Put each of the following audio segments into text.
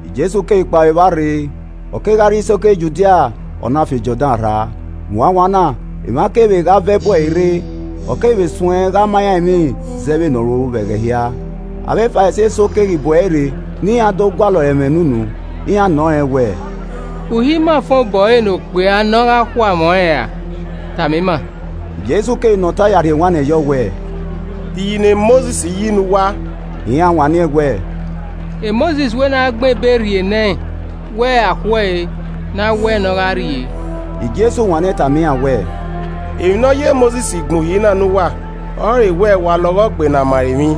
Jesu ghi kpao vbe evba rre, ọ kegha rrie isoko Judia, ọ na fian Jọdan rra. Wanwanna, emwa keghi vbe gha vẹ bu ẹre rre, ọ keghi vbe suẹn gha ma iran emwi zẹ vbene ọ ru vbe ẹghẹ hia. Avbe Farisi eso keghi bu ẹre rre ne iran do gualọ ẹre ẹmwẹ ne unu. Iran nọ rẹn wẹẹ, “Uhi ima fan obọ ẹre ne okpia ne ọ gha khu amwẹ ọnrẹn ra? Tama ima.” Jesu keghi nọ ọta ya rhie ewanniẹn yọ wẹẹ, “De iyi ne Mosis yi ne uwa?” Iran wanniẹn wẹ, “Mosis wẹ ne a gbẹn ebe rhie nẹ ẹn wẹ a khu ẹe, ne a wẹ ne ọ gha rrie.” Jesu wanniẹn tama iran wẹẹ, “Emwi ne ọ ye Mosis gbẹn uhi na ne uwa ọrọre wẹ, wa lọghọ gbe ne a ma ẹre emwi.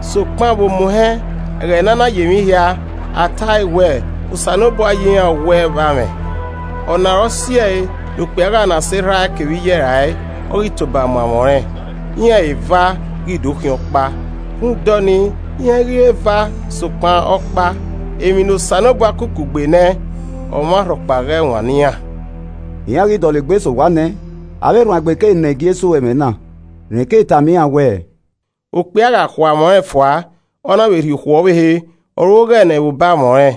Sokpan vbe omuhẹn, ẹghẹ ne a na yi emwi hia, a ta ẹe wẹẹ, ‘Osanobua yi iran ọwẹe vbe amwẹ. Ọna ọre ọ si ẹe ne okpia gha na sẹ erha ẹe kevbe iye ẹe rae, ọ ghi toba mu amwẹ ọnrẹn. Iran eva ghi do khian ọkpa.’ Rhunmwuda ọnii, iran i ghi re eva sokpan ọkpa. Emwi ne Osanobua ku kugbe nẹ ọmwarhọkpa ghẹ wannọ iran.” Iran ghi dọlegbe sẹ owa nẹ, avbe erhuanegbe keghi nọ Jesu ẹmwẹ na. Rẹn keghi tama iran wẹẹ, “Okpia gha khu amwẹ ọnrẹn fua, ọ na vbe rhie okhuo ọvbehe, ọ ru oghẹ nẹ vbe obọ amwẹ ọnrẹn.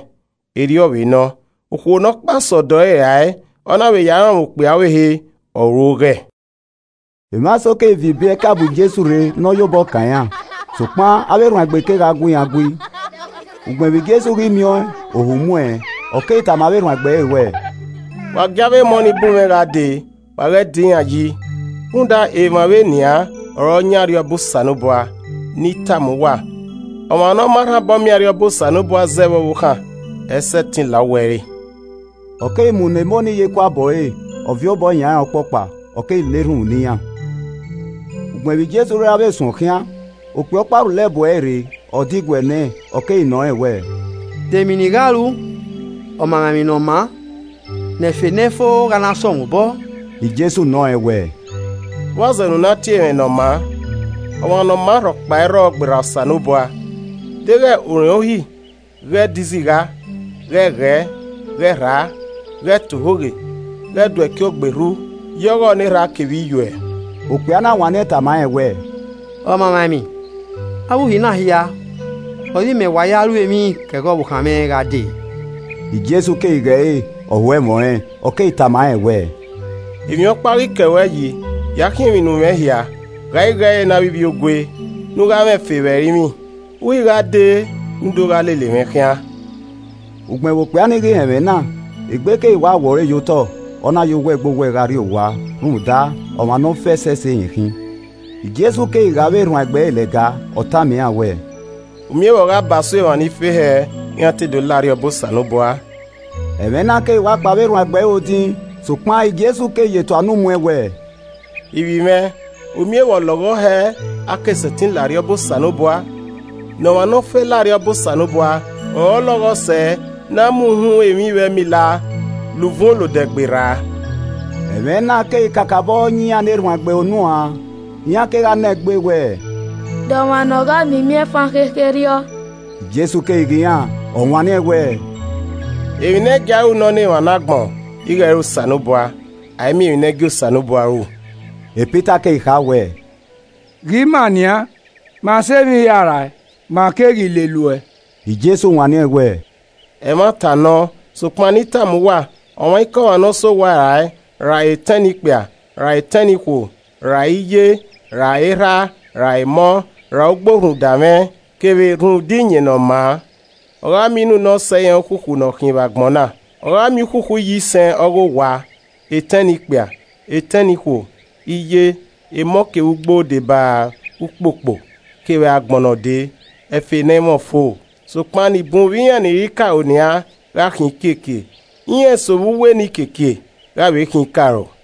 Erriọ vbe nọ, okhuo ne ọ kpaa sẹ ọdọ ẹre rae, ọ na vbe ya rọnmwẹ okpia ọvbehe, ọ ru oghẹ.” Emwa eso keghi viọ ibiẹka bu Jesu rre ne ọ ya obọ kan iran, sokpan avbe erhuanegbe kegha gu iran gui. Ugbẹn vbe Jesu ghi miẹn ọẹn, ohu mu ẹn ọ keghi tama avbe erhuanegbe ẹre wẹẹ, “Wa gie avbe emọ nii bu mwẹ gha dee wa ghẹ da iran yi, rhunmwuda emwa vbe nian ọre ọ yan Arriọba Osanobua. Ne I tama uwa, ọmwa ne ọ ma rhan obọ miẹn Arriọba Osanobua zẹ vbe ọvbokhan, ẹ i sẹtin la uwu ẹre.” Ọ keghi mu nọ emọ nii ye ekuabọ ẹre, ọ viọ obọ yan iran ọkpọkpa, ọ keghi na erhunmwu ne iran. Ugbẹn vbe Jesu ghi ra vbe suẹn okhian, okpia ọkpa rhulẹ bu ẹre rre, ọ diguẹ nẹ, ọ keghi nọ rẹn wẹẹ, “De emwi ne I gha ru, Ọmamwaemwi ne ọ maa, ne ẹfe ne ẹ i fo gha na sẹ mwẹ obọ?” Jesu nọ rẹn wẹẹ, “Vbọzẹ ne u na tie mwẹ ne ọ maa? Ọmwa ne ọ maa rhọkpa i rrọọ gberra Osanobua. Deghẹ u rẹn uhi ghẹ do izigha. Ghẹ ghẹe, ghẹ rhaa, ghẹ ta ohoghe, ghẹ do ẹki ogberhu, ye ọghọ ne erha kevbe iyuẹ.” Okpia na wanniẹn tama rẹn wẹẹ, “Ọmamwaemwi, avbe uhi na hia ọre imẹ wa ya ru emwi ke ẹghẹ ọvbokhan mwẹ gha dee.” Jesu keghi ghe ẹre, ọ ho ẹmwẹ ọnrẹn, ọ keghi tama rẹn wẹẹ, “Emwi ọkpa ọ ghi kẹ ruẹ yi, ya khiẹn emwi ne umwẹ hia, ghae igho ẹre ne avbe ivbiogue, ne u gha mwẹ ẹfe vbe ẹrinmwi, u ghi gha dee ne u do gha lele mwẹ khian.” Ugbẹn vbe okpia nii ghi họn ẹmwẹ na, egbe keghi wa wọ ẹre ye otọ, ọ na ye owẹ gbe owẹ gha rrie, rhunmwuda, ọmwa ne ọ fe ẹsẹse rẹn khin. Jesu keghi ghe avbe erhuanegbe ẹre lẹga, ọ tama iran wẹẹ, “U miẹn vbe ọ gha ba so emwa ni fe hẹ iran te do la Arriọba Osanobua!” Ẹmwẹ na keghi wa kpan avbe erhuanegbe ẹre odin. Sokpan Jesu keghi ye tua unu mu ẹn wẹẹ, “Ivbi mwẹ u miẹn vbe ọlọghọ hẹ a ke sẹtin la Arriọba Osanobua! Ne ọmwa ne ọ fe lao Arriọba Osanobua ọre ọ lọghọ sẹ ne a mu uhunmwu emwi vbe ẹmila la uvun olodẹ gberra.” Ẹmwẹ na keghi kakabọ yan iran ne erhuanegbe ẹre unu uan, iran kegha nọ egbe wẹẹ, “De ọmwa nọ gha miẹn imiẹnfan khekherriọ?” Jesu keghi ghe iran, ọ wanniẹn wẹẹ, “Emwi ne ẹ i gie a ru nọ ne emwa ne agbọn ighe ẹ i re Osanobua, a i miẹn emwi ne ẹ i gie Osanobua ru.” Pita keghi kha wẹẹ, “Ghe ima nian, ma sẹ emwi hia rae, ma keghi lele uẹ.” Jesu wanniẹn wẹẹ, “Ẹmwata nọ sokpan ne I tama uwa, ọmwaikọmwa ne ọ sẹ owa rae, ra etẹn ne ikpia, re etẹn ne ikhuo, ra iye, ra erha, ra emọ, ra ugbo rhunmwuda mwẹ, kevbe rhunmwuda iyẹn ne ọ maa. Ọ gha miẹn inu ne ọ sẹ iran ukhukhu ne ọ khin vbe agbọn na, ọ gha miẹn ukhukhu iyisẹn ọ ghe owa, etẹn ne ikpia, etẹn ne ikhuo, iye, emọ kevbe ugbo deba ukpokpo, kevbe agbọn ne ọ dee, ẹfe ne ẹ i mwẹ ọfo. Sokpan ni bun vbe iran ni re ikaro nian gha khian ikiekie, iran eso vbe uwu enikiekie gha vbe khian ikaro.”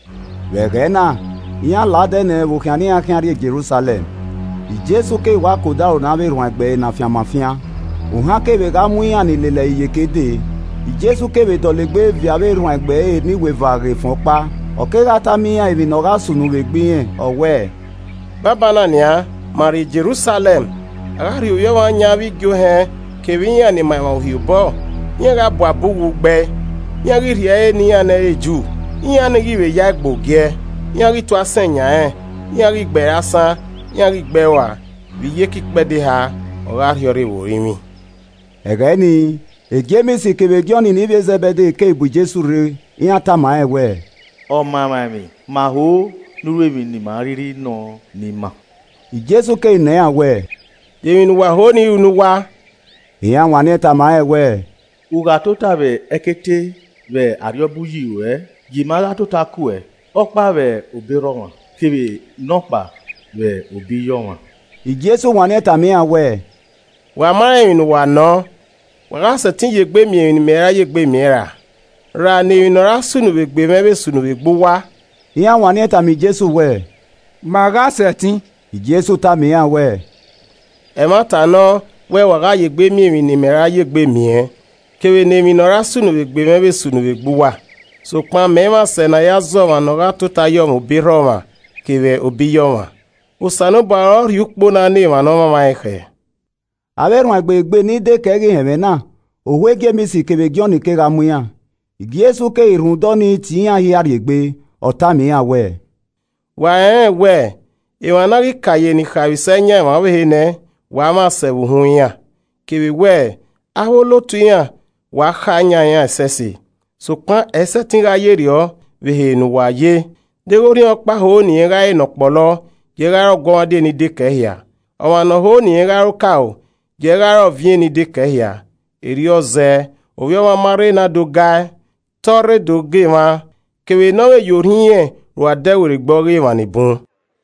Vbe ẹghẹ na, iran la odẹ nẹ vbe okhian ne iran khian rrie Jerusalẹm. Jesu keghi wa ke odaro ne avbe erhuanegbe ẹre ne afianma fian, ohan keghi vbe gha mu iran ni lele ẹre iyeke dee, Jesu keghi vbe dọlegbe viọ avbe erhuanegbe ẹre ne iweva ghe ẹfẹn ọkpa, ọ kegha tama iran emwi ne ọ gha sunu vbe egbe irẹn. Ọ wẹẹ, “Banbanna nian, ma rrie Jerusalẹm. A gha rhie Ovbi Ọmwa yan avbe igie ohẹn kevbe iran ni ma emwa Uhi obọ. Iran gha bu abe uwu gbe ẹe, iran ghi rhie ẹre ne iran ne ẹ i re Ju. Iran nii ghi vbe ya ẹe gbe ogiẹ, iran ghi tu asẹn yan rẹn, iran ghi gbe ẹre asan, iran ghi gbe ẹe rua. Vbe iyeke ikpẹdẹ eha, ọ gha rhiọrre vbe orinmwi.” Ẹghẹ nii, Jems kevbe Jọn ne ivbi e Zẹbede keghi bu Jesu rre. Iran tama rẹn wẹẹ, “Ọmamwaemwi, ma ho ne u ru emwi ne ima a rhirhi nọ ne ima.” Jesu keghi nọ iran wẹẹ, “De emwi ne uwa ho ne I ru ne uwa?” Iran wanniẹn tama rẹn wẹẹ, “U gha tota vbe ẹkete vbe Arriọba uyi ruẹ, gie ima gha tota kuẹ, ọkpa vbe obọ erha ọmwa kevbe nọkpa vbe obọ iye ọmwa.” Jesu wanniẹn tama iran wẹẹ, “Wa ma rẹn emwi ne uwa nọ, wa gha sẹtin ye egbe miẹn emwi ne I ra ye egbe miẹn ra, ra ne emwi ne ọ ra sunu vbe egbe mwẹ vbe sunu vbe egbe uwa?” Iran wanniẹn tama Jesu wẹẹ, “Ma gha sẹtin.” Jesu tama iran wẹẹ, “Ẹmwata nọ wẹ wa gha ya egbe miẹn emwi ne imẹ ra ya egbe miẹn kevbe ne emwi ne ọ ra sunu vbe egbe mwẹ vbe sunu vbe egbe uwa. Sokpan mẹ i mwẹ asẹ ne a ya zẹ ọmwa ne ọ gha tota yọmwẹ obọ erha ọmwa kevbe obọ iye ọmwa. Osanobua ọre ọ rhie ukpo na ne emwa ne ọ mwamwa ẹn khẹ.” Avbe erhuanegbe igbe ni dekẹe ghi họn ẹmwẹ na, ohu Jems kevbe Jọn kegha mu iran. Jesu keghi rhunmwuda ọnii tie iran hia rrie egbe, ọ tama iran wẹẹ, “Wa rẹnrẹn wẹẹ, emwa ne a ghi ka ye ni khaemwisẹ yan emwa ọvbehe nẹ, wa mwẹ asẹ vbe uhunmwu iran, kevbe wẹ avbe olotu iran wa kha yan iran ẹsẹse. Sokpan ẹ i sẹtin gha yerriọ vbe ehe ne uwa ye. Deghẹ orhiọnkpa ho ne irẹn gha re ne ọ kpolo, gie ẹe gha re ọguọmwadia eni dekẹe hia. Ọmwa ne ọ vbe ho ne irẹn gha re okaro, gie ẹe gha re ọviẹn eni dekẹe hia. Erriọ zẹẹ, Ovbi Ọmwa ma rre ne a do ga ẹe, te ọ rre do ga emwa, kevbe ne ọ vbe ya orhiọn irẹn ru adẹwerriegbe ọghe emwa ni bun.”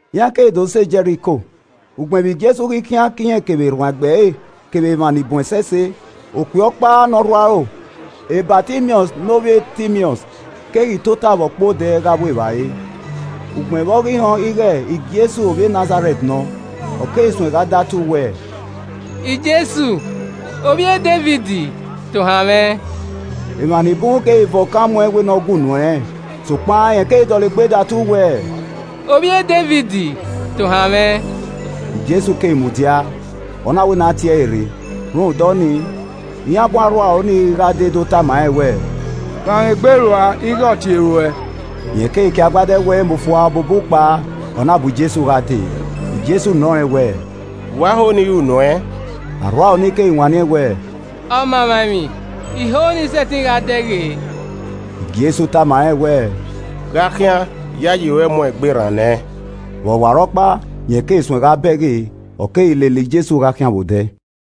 Iran keghi do sẹ Jẹriko. Ugbẹn vbe Jesu ghi khian ke irẹn kevbe erhuanegbe ẹre kevbe emwa ni bun ẹsẹse, okpia ọkpa ne ọ rhu aro, Batimiọs ne ovbi Timiọs keghi tota vbe ọkpẹn odẹ gha vbu evbare. Ugbẹn vbe ọ ghi họn ighe Jesu ovbi Nazarẹt nọ, ọ keghi suẹn gha datu wẹẹ, “Jesu Ovbi e Devid! Tohan mwẹ!” Emwa ni bun keghi van okan mu ẹn wẹ ne ọ gue unu ẹnrẹn. Sokpan rẹn keghi dọlegbe datu wẹẹ, “Ovbi e Devid, Tohan mwẹ!” Jesu keghi mudia, ọ na wẹ ne a tie ẹre rre. Rhunmwuda ọnii, iran bu arhuaro nii gha dee do tama rẹn wẹẹ, “Fanmwẹ egbe rua ighe ọ tie ruẹ.” Rẹn keghi kie agbada ẹwu ẹre mu fua, ọ bubu kpao, ọ na bu Jesu gha dee. Jesu nọ rẹn wẹẹ, “Vbe ua ho ne I ru nu ẹn?” Arhuaro nii keghi wanniẹn wẹẹ, “Ọmamwaemwi, I ho ne I sẹtin gha dẹghe.” Jesu tama rẹn wẹẹ, “Gha khian iyayi ruẹ mu uẹn egbe rran nẹ.” Vbe ọwarọkpa, rẹn keghi suẹ gha bẹghe, ọ keghi lele Jesu gha khian vbe odẹ.